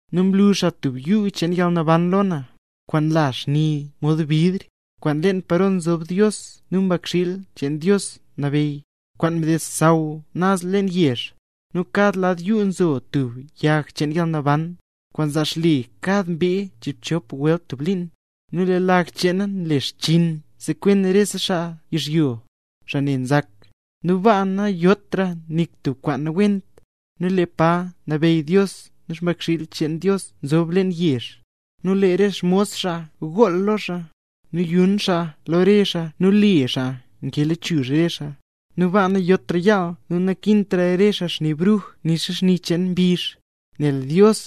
Nu mlu xaa tub yuu cheen yalnaban lo na, kwaan nla xni mod bidr, kwaan nlen paro nzob Dios nu Mbakxiil cheen Dios nabeyy, kwaan nded xsaww naz leen yezh. Nu kad lad yuu nzo tub yag cheen yalnaban, kwaan nzaa xle kad mbee chiibchop welt tub liin; nu lee lag cheena nle xchiin sekwen rese xaa yizhyo, xaa ne nzak. Nu baa nayotra nik tub kwaan nawent; nu lee pa nabeyy Dios nu Mbakxiil cheen Dios zob leen yezh, nu lee re xmos xaa gool lo xaa; nu yun xaa lo re xaa nu le xaa kee lechuzh re xaa. Nu baa nayotra yaal nu nakintra re xaa xni bruj nixa xni cheen mbizh, nel Dios,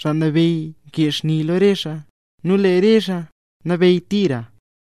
Xaa Nabeyy kee xni lo re xaa; nu lee re xaa nabeyy tira.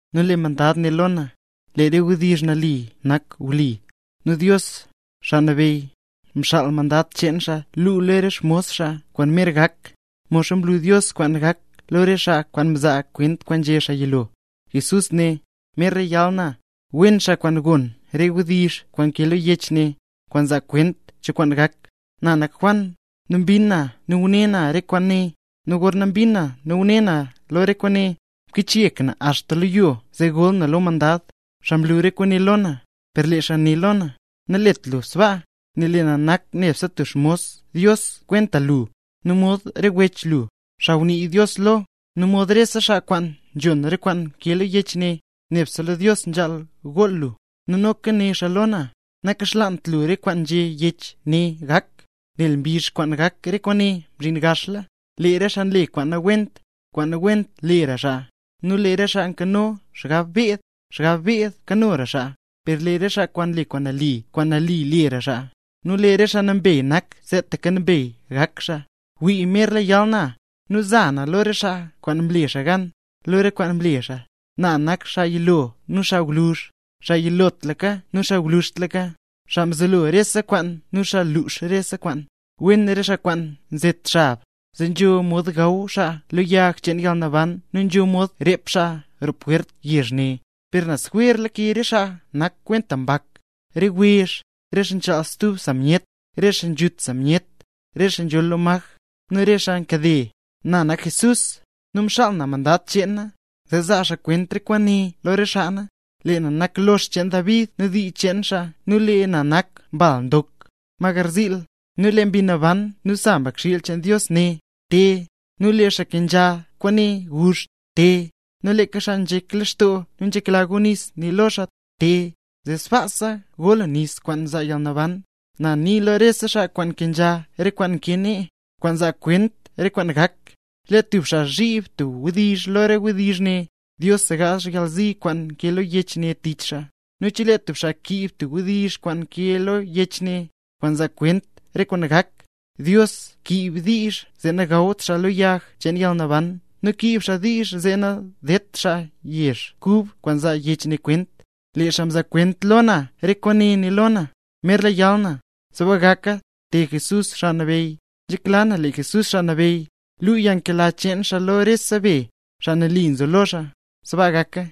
Nu lee mandad né lo na: —Lee re wdizh ne nali nak nu wli; nu Dios, Xaa Nabeyy, mxaal mandad cheen xaa lu lo re xmos xaa kwaan merla gak, modxa mlu Dios kwaan gak lo re xaa mzaa kwent kwaan nzhé Dios lo lee xaa yilo. Jesús né: —¡Merla yal na! ¡Wen xaa kwaan gon re wdizh kwaan nkee lo yech ne, kwaan nzaa kwent cho kwaan gak! Na nak Juan, nu mbin na nu ngune na re kwaane. Nu gorna mbin na nu ngune na lo re kwaane, mkichyek na axta lo yo zee gol na lo mandad, xaa mlu re kwaane lo na. Per lee xaa né lo na: —Nalet lu sbaa, nel na nak nebse tub xmos Dios kwenta lu, nu mod re wech lu, xaa ngunii Dios lo, nu mod rese xaa kwaan nzhon re kwaan nkee lo yech ne. Nebse lo Dios nzhaal gool lu. Nu noka né xaa lo na: —Nakaxlaant lu re kwaan nzhé yech ne gak, nel mbizh kwaan gak re kwaane mzhin gaxla. Lee re xaa nle kwaan nawent, kwaan nawent lera xaaya, nu lee re xaa nkano xgab beed, xgab beed kanora xaa; per lee xaa nle kwaan nali kwaan nali lera xaa, nu lee xaa nambey nak seetaka nambey gak xaa. Zee né Jesús lo na: —¡Wii, merla yal na! Nu na za lo re xaa kwaan mle re xaa gan, lo re kwaan mle xaa. Na nak xaa yilo nu xaa gwluzh, xaa yilotlaka nu xaa gwluzhtlaka, xaa mzelo rese kwaan nu xaa lux rese kwaan. ’Wen re xaa kwaan nzet xab, zee nzho mod gaw xaa lo yag cheen yalnaban nu nzho mod rep xaa roo pwert yezh ne. Per naz jwer lake re xaa nak kwenta mbak: re wezh, re xaa nchaal stub naz samyet, re xaa nzhut samyet, re xaa nzholl lo maj, nu rese xaa nkade. ’Na nak Jesús, nu mxaal na mandad cheen na, zee zaa xaa kwent re kwaane lo re xaa na. Lee na nak lox cheen David nu dii cheen xaa nu lee na nak Mbal Ndok, ma garziil. Nu lee Mbi Naban nu sa Mbakxiil cheen Dios né: —Te. Nu lee xaa nkenzha kwaane, guzh: —Te. Nu lee xaa nzhek lextoo nu nzhekla go nis, nii na lo xaa: —Te, zee sbaasa go lu nis kwaan nzaa yalnaban. Na nii lo rese xaa kwaan nkenzha re kwaan nkee ne, kwaan nzaa kwent re kwaan gak: Chelee tub xaa zhib tub wdizh lo re wdizh ne, Dios segaazh re yalzi kwaan nkee lo yech ne tich xaa. Nu chelee tub xaa kiib tub wdizh kwaan nkee lo yech ne, kwaan nzaa kwent re kwaan gak, Dios kiib diizh zee nagawt xaa lo yag cheen yalnaban nu kiib xaa diizh zee nadedt xaa yezh kub, kwaan nzaa yech ne kwent. Lee xaa mzaa kwent lo na re kwaane, né lo na: —Merla yal na. ¡Sbaa gaka! ¡Te Jesús, Xaa Nabeyy! Nzhekla na lee Jesús Xaa Nabeyy, luu yalnkela cheen xaa lo rese be, xaa nali nzo lo xaa. Sbaa gaka.